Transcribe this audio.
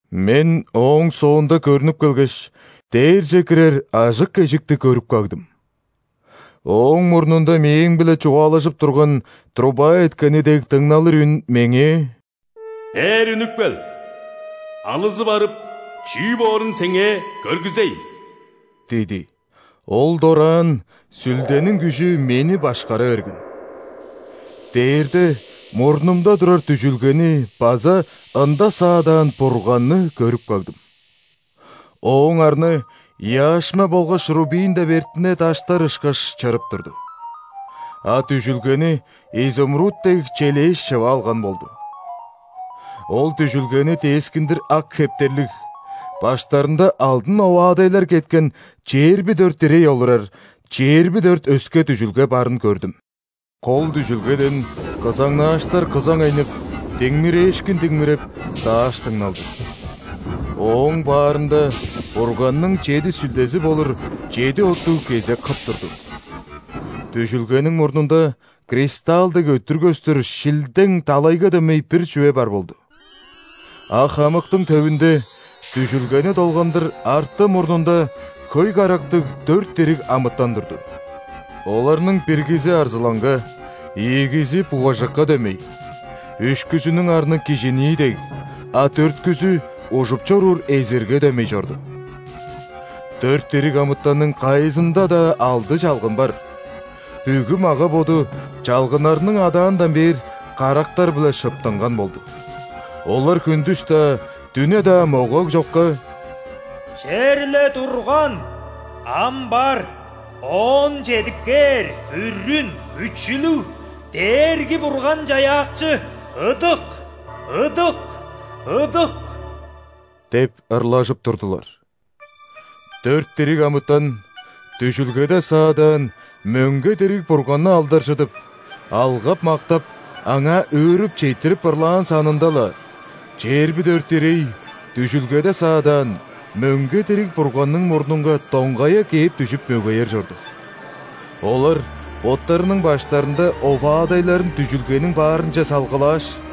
Мен ооң соонда көрнүп келгеш, дээрже кирер ажык эжикти көрүп кагдым. Ооң мурнунда мээң-биле чугаалажып турган, труба эткени дег дыңналыр үн меңээ: «Бээр үнүп кел, алызы барып чүү боорун сеңээ көргүзейн» – диди. Ол дораан Сүлдениң күжү мени башкара берген. Дээрде, мурнумда турар дүжүлгени база ында саадаан Бурганны көрүп кагдым. Ооң арны яшма болгаш рубин деп эртине даштар ышкаш чырып турду, а дүжүлгени изумруд дег челээш шыва алган болду. Ол дүжүлгени дескиндир ак хептерлиг, баштарында алдын оваадайлар кеткен чээрби дөрт ирей олурар чээрби дөрт өске дүжүлге барын көрдүм. Кол дүжүлгеден кызаңнааштар кызаңайнып, диңмирээшкин диңмиреп, дааш дыңналды. Ооң баарында Бурганның чеди сүлдези болур чеди оттуг кезек хып турду. Дүжүлгениң мурнунда кристалл дег өттүр көстүр шилдең далайга дөмей бир чүве бар болду. А хамыктың төвүнде, дүжүлгени долгандыр арты-мурнунда хөй карактыг дөрт дириг амытан турду. Оларның биргизи арзылаңга, ийигизи бугажыкка дөмей, үшкүзүнүң арны кижинии дег, а дөрткүзү ужуп чоруур эзирге дөмей чорду. Дөрт дириг амытанның кайызында-даа алды чалгын бар, бүгү мага-боду, чалгыннарының адаандан бээр, карактар-биле шыптынган болду. Олар хүндүс-даа, дүне-даа могаг чокка:«Черле турган, ам бар, оон чедип кээрБүрүн Күчүлүг Дээрги-Бурган-Чаяакчыыдык, ыдык, ыдык!» – деп ырлажып турдулар. Дөрт дириг амытан дүжүлгеде саадаан мөңге дириг Бурганны алдаржыдып, алгап-мактап, Аңаа өөрүп четтирип ырлаан санында-ла, чээрби дөрт ирей дүжүлгеде саадаан, мөңге дириг Бурганның мурнунга доңгая кээп дүжүп мөгеер чорду. Олар боттарының баштарында оваадайларын дүжүлгениң баарынче салгылааш: